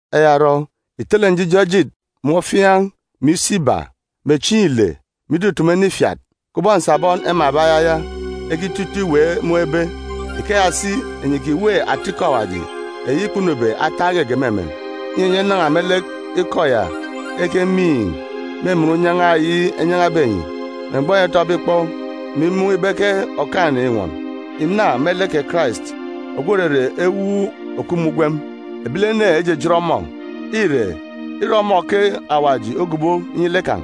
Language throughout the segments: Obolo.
Eya orọ, ìtele njijọ ejit, mè ofiaan̄, mè isi iba, mè chieen̄ ile, mè itutumu ene ifiat. Kubọk nsabọn emanbe ayaya ekito ito iweek mun̄ ebe, ikeya si, enyi ìkiweek atalek mun̄ ebe eyi ekwukwu, eyi òrere ata ikọ Awaji eyi kpunube ataak geege me emen, inyi enyi enan̄a me lek ikọ ya ekemiin̄ me emen unyan̄a eyi enyan̄abe enyi, me mgbọ keyi enyi etọbe ikpọ, mè imun̄ ibe ke Okaan̄-ene înwọn. Ìna me lek kè Karais ogwu òrere ewuuk òkup me ugwem. Ebilene ejijit ọmọ, ire, îre ọmọ ke Awaji ogobo inyi lek kan̄.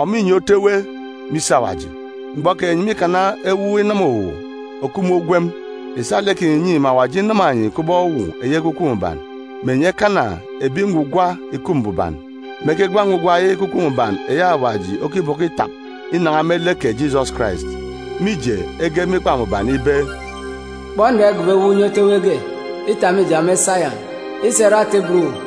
Ọmọ înye otu ewe me isi Awaji. Mgbọ keyi enyi mîkana ewuuk inama-uwu òkup me ugwem. Ìsa lek kinyi ìnyi, mè Awaji inama enyi kubọk uwu eyi Ekwukwu Mbuban, mè enyi ekana ebi ngwugwa ìkup mbuban, mè ekegwa ngwugwa eyi Ekwukwu Mbuban eyi Awaji okibọkọ itap inan̄a me lek kè Jisọs Karais. Mije, ege me Ikpa Mbuban ibe, “Kpọ, nra igobo ewuuk unye otu ewe ge itap me ijọn̄ me Sayọn, isa irọ atà ibot uwu.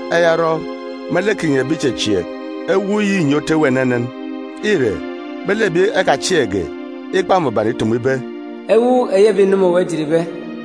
Eya orọ, me lek kinyi ebi ìchechieek, ewuuk yi înye otu ewe enenen. Ire, me lek ebi ekachieekge, Ikpa Mbuban ìtumu ibe, “Ewuuk eyi ebi ìnama uwu ejitbe,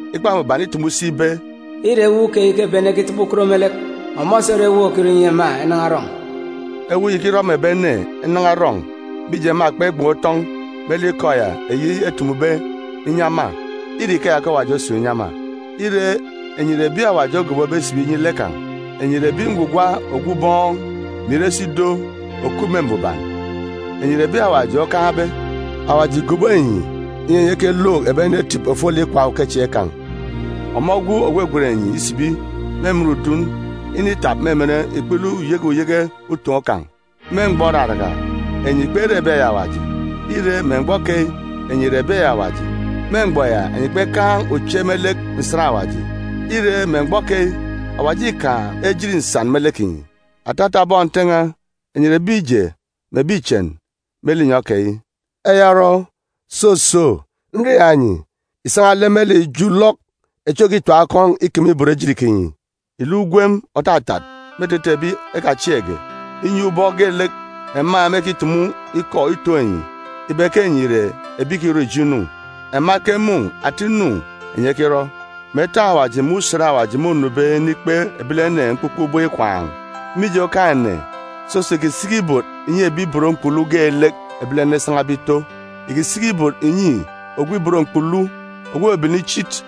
Ikpa Mbuban îtumu si ibe, “Îre ewuuk keyi ke ebi ene ekitọbọ ukot me lek. Ọmọ si ore ewuuk òkirọ inyi ema enan̄a erọn̄.”c Ewuuk yi ìkirọ mè ebi ene enan̄a erọn̄, mije, ema kpegban̄ utọn̄ me lek ikọ ya eyi etumube inyi ema. Îre ikeya ke Awaji osun̄ inyi ema. Ire, enyi ìre ebi Awaji ogobobe isibi inyi lek kan̄. Enyi ìre ebi ngwugwa ogwu ubọọn̄, mè ire si ido òkup me mbuban. Enyi ìre ebi Awaji okaan̄be. Awaji ìgobo enyi, inyi enyi ekelook ebi ene etip ofolek ikwaan̄ ukechieen̄ kan̄, ọmọ ogwu ògwegwen enyi isibi me emen udun initap me emen ikpele uyeke uyeke utoon̄ kan̄. Me mgbọ òraraka, enyi kpere ebi eyi Awaji. Ire, me mgbọ keyi, enyi ìre ebi eyi Awaji. Me mgbọ ya, enyi kpekaan̄ uche me lek nsan Awaji. Ire, me mgbọ keyi, Awaji îkaan̄ ejit nsan me lek kinyi. Atata bọn Nte n̄a, enyi ìre ebi ije mè ebi ichen me linyọn̄ keyi. Eya orọ, soso, nriaak enyi, ìsan̄a lek me lek ijo ulọk echi òkitim akọn̄ ikeme ibot ejit kinyi. Ìluk ugwem òtatat me etete ebi ekachieekge, inyi, ubọk geelek ema mêkitumu ikọ itoon̄ enyi ibe ke enyi ìre ebi ìkirọ ijo inu, ema ekemun̄ ata inu enyi ekirọ, mè etọn̄ Awaji me usen Awaji mônube inikpe ebilene mkpukpe ubọk ikwaan̄. Mije Okaan̄-ene, soso ìkisiki ibot ìnyi ebi ibot mkpulu geelek ebilene esan̄abe ito. Ìkisiki ibot ìnyi ogwu ubọọn̄, kubọk ogwu ibot mkpulu ogwu òbebene ichit.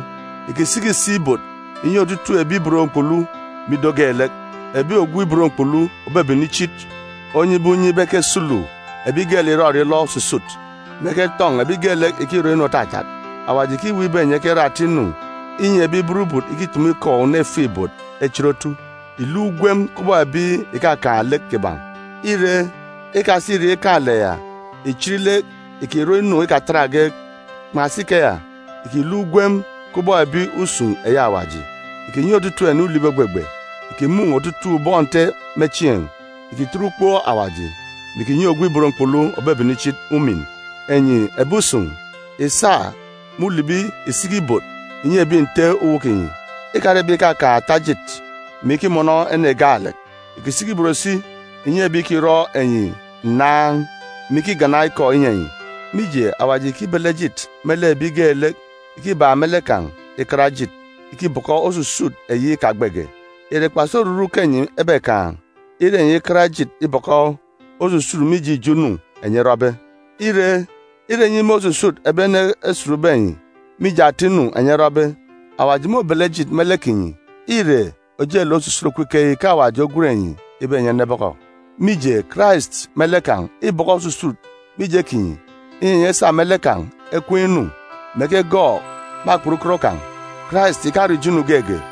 Ìkisiki si ibot ìnyi otutuuk ebi ibot mkpulu me ido geelek, ebi ogwu ibot mkpulu òbebene ichit onyibe unye ibe ekesulu ebi geelek ìrọrọ ilọ osusut, mè eketọn̄ ebi geelek ìkirọ inu òtatat. Awaji ìkiweek ibe enyi ekerọ ata inu esa erọ inyi ebi burubut, ìkitumu ikọ una ifuk-ibot, echit otu. Ìluk ugwem kubọk ebi ìkakaan̄ lek kiban̄. Ire, ikasa irek ikaan̄-lek ya ìchit lek ìkirọ inu ikatatge. Kpan̄asi ikeya, ìkiluk ugwem kubọk ebi usun̄ eyi Awaji. Ìkinyi otutuuk ene ulibi ògbegbe. Ìkimun̄ otutuuk bọn Nte me chieen̄. Ìkitet ukpook Awaji, mè ìkinyi ogwu ibot mkpulu òbebene ichit umin. Enyi ebi usun̄, ìsa me ulibi ìsiki ibot ìnyi ebi nte uwu kinyi. Ìkare ebi ìkakaan̄ ata ejit mè ikimọnọ ene gaalek, ìkisiki ibot si ìnyi ebi ìkirọ enyi nnaan̄, mè ikigana ikọ inyi enyi. Mije, Awaji îkibele ejit me lek ebi geelek ìkibak me lek kan̄ ikat ejit ikibọkọ osusut eyi ikagbege. Ìre kpasi oruru ke enyi ebekaan̄, ire enyi ikat ejit ibọkọ osusut mije ijo inu enyi erọbe? Ire, ire enyi ime osusut ebi ene esutbe enyi mije ata inu enyi erọbe, Awaji môbele ejit me lek kinyi. Îre ojelek osusut òkup ikeyi ke Awaji ogwen enyi ibe enyi enebọkọ. Mije, Karais me lek kan̄ îbọkọ osusut mije kinyi, inyi enyi esa me lek kan̄ ekween̄ inu, mè ekegọọk me akpat ukot kan̄. “Karais ìkarọ ijo inu geege.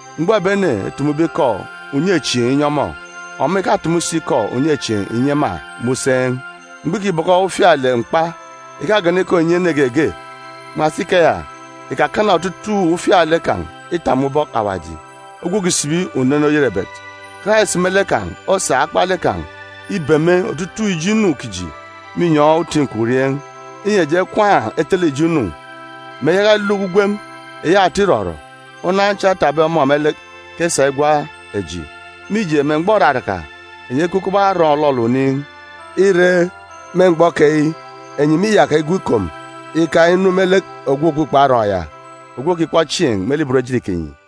Mgbọ ebi ene etumube ikọ unyechieen̄ inyi ọmọ, ọmọ ìkatumu si ikọ unyechieen̄ ìnyi ema me useen̄. Mgbọ îkibọkọ ufialek mkpa, ìkagana ikọ ìnyi ene geege. Kpan̄asi ikeya ìkakana otutuuk ufialek kan̄ itap me ubọk Awaji ogwu òkisibi unen oyerebet. Karais me lek kan̄ osa akpalek kan̄ ibeme otutuuk ijo inu kiji me inyọn̄ uti nkwurieen̄, inyi eji ekwaan̄ etele ijo inu, mè eyaka eneluk ugwem eyi ata irọrọ. Unan cha etapbe ọmọ me lek ke esa igwa eji. Mije, me mgbọ òraraka, enyi ekup kubọk arọọn̄ òlọlọ oniin̄. Ire, me mgbọ keyi, enyi mîyaka igwu ikom ika inu me lek ogwu Òkpukpo Arọọn̄ ya, Ogwu Òkikpọ Chieen̄ me lek ibot ejit kinyi.